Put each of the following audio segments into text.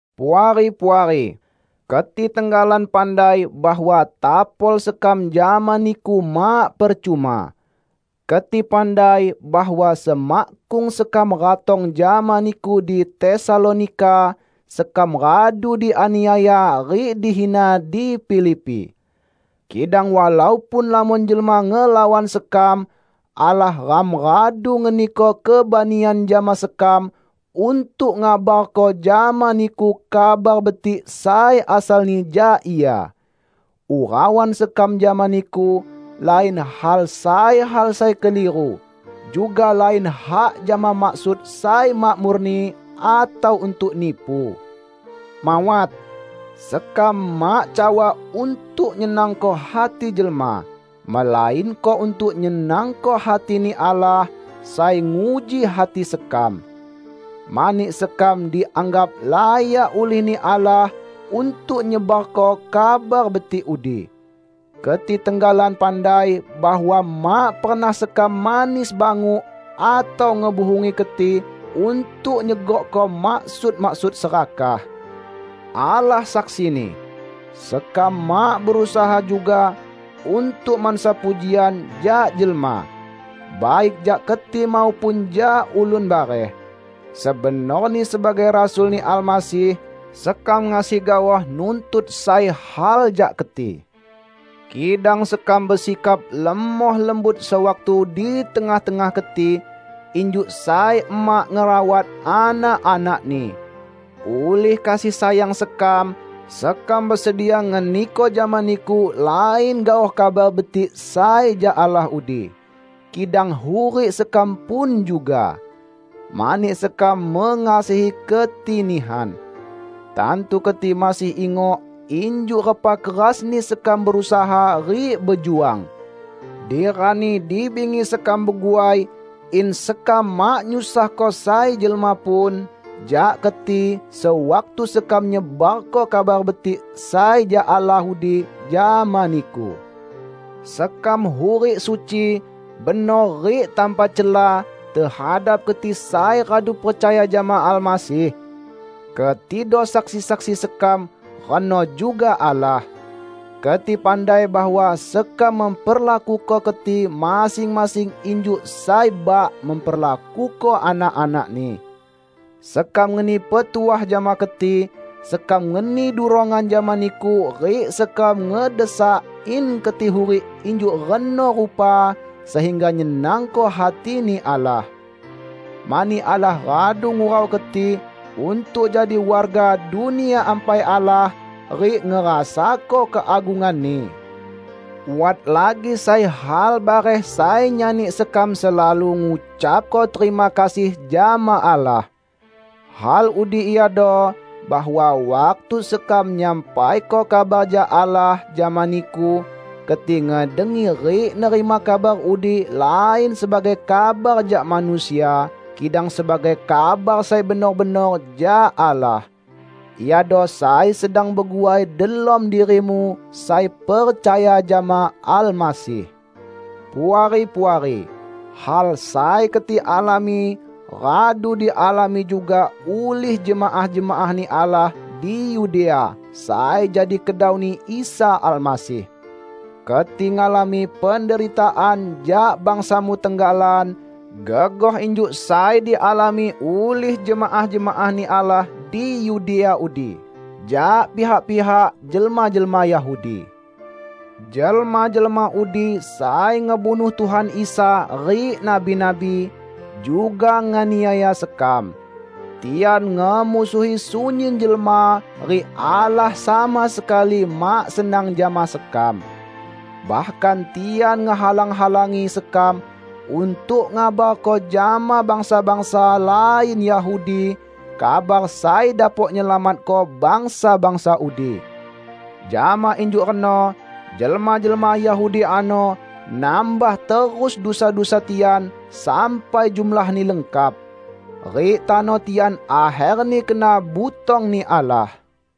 Puari-puari! Keti tenggalan pandai bahwa tapol sekam jama niku mak percuma. Keti pandai bahwa semakkung sekam ratong jama niku di Tesalonika, sekam radu dianiaya rik dihina di Filipi. Kidang walaupun lamon jelma ngelawan sekam, Allah ram radu ngeniko kebanian jama sekam untuk ngabarko jama niku Kabar Betik sai asalni jak Ia. Urauan sekam jama niku lain hak sai hal sai keliru; juga lain hak jama maksud sai mak murni atau untuk nipu. Mawat! Sekam mak cawa untuk nyenangko hati jelma, melainko untuk nyenangko hati-Ni Allah, sai nguji hati sekam. Mani sekam dianggap layak ulih-Ni Allah untuk nyebarko Kabar Betik udi. Keti tenggalan pandai bahwa mak pernah sekam manis banguk atau ngebuhungi keti untuk nyegokko maksud-maksud serakah. Allah saksini! Sekam mak berusaha juga untuk mansa pujian jak jelma -- baik jak keti maupun jak ulun bareh. Sebenorni sebagai rasul-Ni Almasih, sekam ngasi gaoh nuntut sai hal jak keti. Kidang sekam besikap lemoh lembut sewaktu di tengah-tengah keti, injuk sai emak ngerawat anak-anakni. Ulih kasih sayang sekam, sekam besedia ngeniko jama niku lain gaoh Kabar Betik sai jak Allah udi, kidang hurik sekam pun juga. Mani sekam mengasihi keti nihan. Tantu keti masih ingok injuk repa kerasni sekam berusaha rik bejuang. Di rani di bingi sekam beguai in sekam mak nyusahko sai jelma pun jak keti sewaktu sekam nyebarko Kabar Betik sai jak Allah udi jama niku. Sekam hurik suci, benor rik tanpa cela tehadap keti sai radu percaya jama Almasih. Ketido saksi-saksi sekam, reno juga Allah. Keti pandai bahwa sekam memperlakuko keti masing-masing injuk sai bak memperlakuko anak-anakni. Sekam ngeni petuah jama keti, sekam ngeni durongan jama niku rik sekam ngedesak in keti hurik injuk reno rupa sehingga nyenangko hati-Ni Allah. Mani Allah radu ngurau keti untuk jadi warga Dunia Ampai Allah rik ngerasako keagungan-Ni. Wat lagi sai hal bareh sai nyani sekam selalu ngucapko terima kasih jama Allah. Hal udi iado, bahwa waktu sekam nyampaiko kabar jak Allah jama niku, keti ngedengi rik nerima kabar udi lain sebagai kabar jak manusia kidang sebagai kabar sai benor-benor jak Allah. Iado sai sedang beguai delom dirimu sai percaya jama Almasih. Puari-puari, hal sai keti alami radu dialami juga ulih jemaah-jemaah-Ni Allah di Yudea sai jadi kedau-Ni Isa Almasih. Keti ngalami penderitaan jak bangsamu tenggalan, gegoh injuk sai dialami ulih jemaah-jemaah-Ni Allah di Yudea udi jak pihak-pihak jelma-jelma Yahudi. Jelma-jelma udi sai ngebunuh Tuhan Isa rik nabi-nabi, juga nganiaya sekam. Tian ngemusuhi sunyin jelma rik Allah sama sekali mak senang jama sekam. Bahkan tian ngehalang-halangi sekam untuk ngabarko jama bangsa-bangsa lain Yahudi kabar sai dapok nyelamatko bangsa-bangsa udi. Jama injuk reno jelma-jelma Yahudi ano nambah terus dusa-dusa tian sampai jumlahni lengkap. Rik tano tian akherni kena butong-Ni Allah.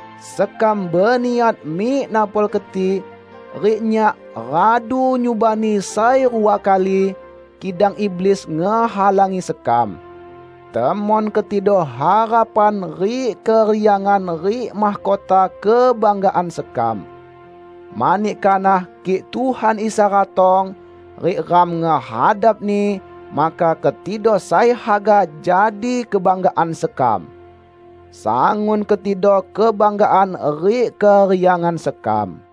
Sekam beniat mik napol keti, rik nyak, radu nyubani sai rua kali, kidang iblis ngehalangi sekam. Temon ketido harapan rik keriangan rik mahkota kebanggaan sekam. Mani kanah kik Tuhan Isa ratong, rik ram ngehadap-Ni, maka ketido sai haga jadi kebanggaan sekam! Sangun ketido kebanggaan rik keriangan sekam.